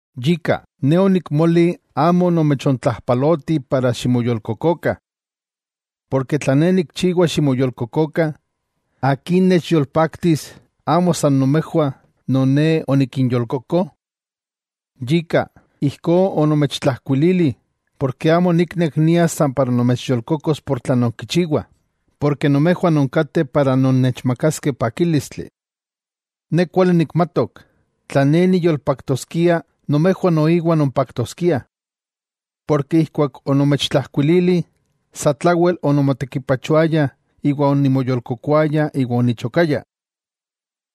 Yika, ne onikmoli amo nomechontlajpaloti para ximoyolkokokah. Porke tla ne nikchiwa ximoyolkokokah, ¿akin nechyolpaktis amo san nomejwah non ne onikinyolkoko? Yika, ijkó onomechtlajkuilili, porke amo oniknek nias san para nimoyolkokos por tlan nonkichiwah, porke nomejwah nonkateh para nonnechmakaskeh pakílistli. Ne kuali nikmatok, tla ne niyolpaktoskia nomejwah noiwa nompaktoskiah. Porke ijkuak onomechtlajkuilili, satlawel onimotekipachoaya iwa onimoyolkokoaya iwa onichokaya.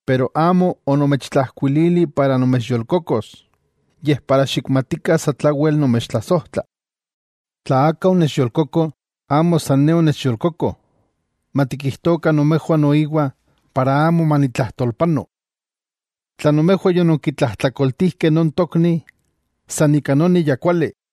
Pero amo onomechtlajkuilili para nomechyolkokos, yej para xikmatikah satlawel nomechtlasojtla. Tla aka onechyolkoko, amo san ne onechyolkoko, matikijtokah nomejwah noiwa para amo manitlajtolpano. Tla nomejwah yononkitlajtlakoltijkeh non tokni, san ika noni ya kuali.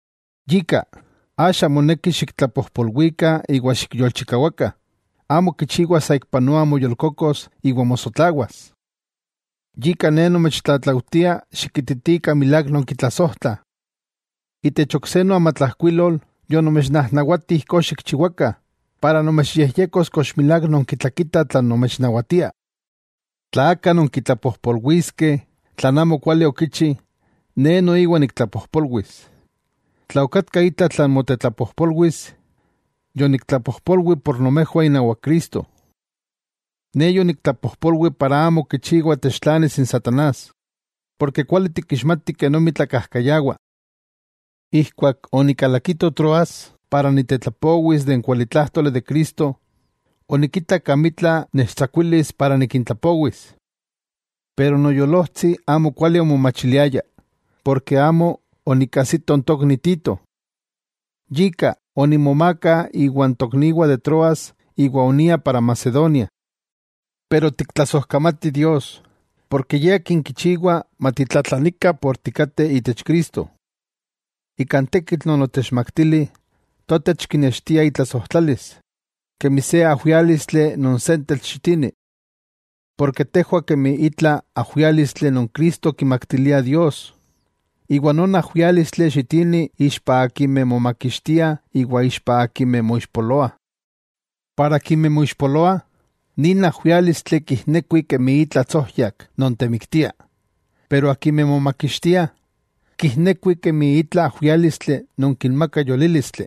Yika, axa moneki xiktlapojpolwikah iwa xikyolchikawakah, amo kichiwa saikpanoa moyolkokos iwa mosotlawas. Yika ne nomechtlatlaujtia xikititikah milák nonkitlasojtlah. Itech ok se noamatlajkuilol yonomechnajnawati ijkó xikchiwakah, para nomechyejyekos kox milák nonkitlakitah tlan nomechnawatia. Tla aka nonkitlapojpolwiskeh tlan amo kuali okichi, ne noiwa niktlapojpolwis. Tla okatka itla tlan motetlapojpolwis, yoniktlapojpolwi por nomejwah inawak Cristo. Ne yoniktlapojpolwi para amo kichiwa techtlanis n satanás, porke kuali tikixmatih kenomi tlakajkayawa. Ijkuak onikalakito Troas para niktetlapowis n kualitlájtoli de Cristo, onikitak amitla nechtsakuilis para nikintlapowis. Pero noyolojtsi, amokuali omomachiliaya, porke amo onikajsito n tokni Tito. Yika, onimomaaka iwa n tokniwah de Troas iwa onia para Macedonia. Pero tiktlasojkamatih Dios, porke Ye Akin kichiwa matitlatlanikah por tikateh itech Cristo. Ika n tekitl non otechmaktili, totech kinextia itlasojtlalis, kemi se ajwiálistli non sentetl xitini. Porke tejwah kemi itla ajwiálistli non Cristo kimaktilia Dios, iwa non ajwiálistli xitini ixpa akimeh momakixtiah iwa ixpa akimeh moixpoloah. Para akimeh moixpoloah, nin ajwiálistli kijnekuih kemi itla tsojyak non temiktia. Pero akimeh momakixtiah, kijnekuih kemi itla ajwiálistli non kinmaka yolílistli.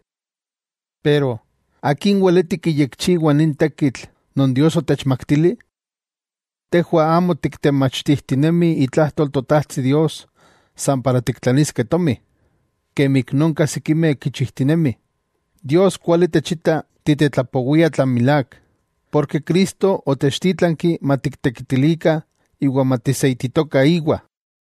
Pero ¿akin weleti kiyekchiwa nin tekitl non Dios otechmaktili? Tejwah amo tiktemachtijtinemih itlajtol Totajtsi Dios san para tiktlaniskeh tomi, kemi ik nonka sikimeh kichijtinemih, Dios kuali techita titetlapowiah tlan milák, porke Cristo otechtítlanki matiktekitilikah iwa matiseititokah íwa.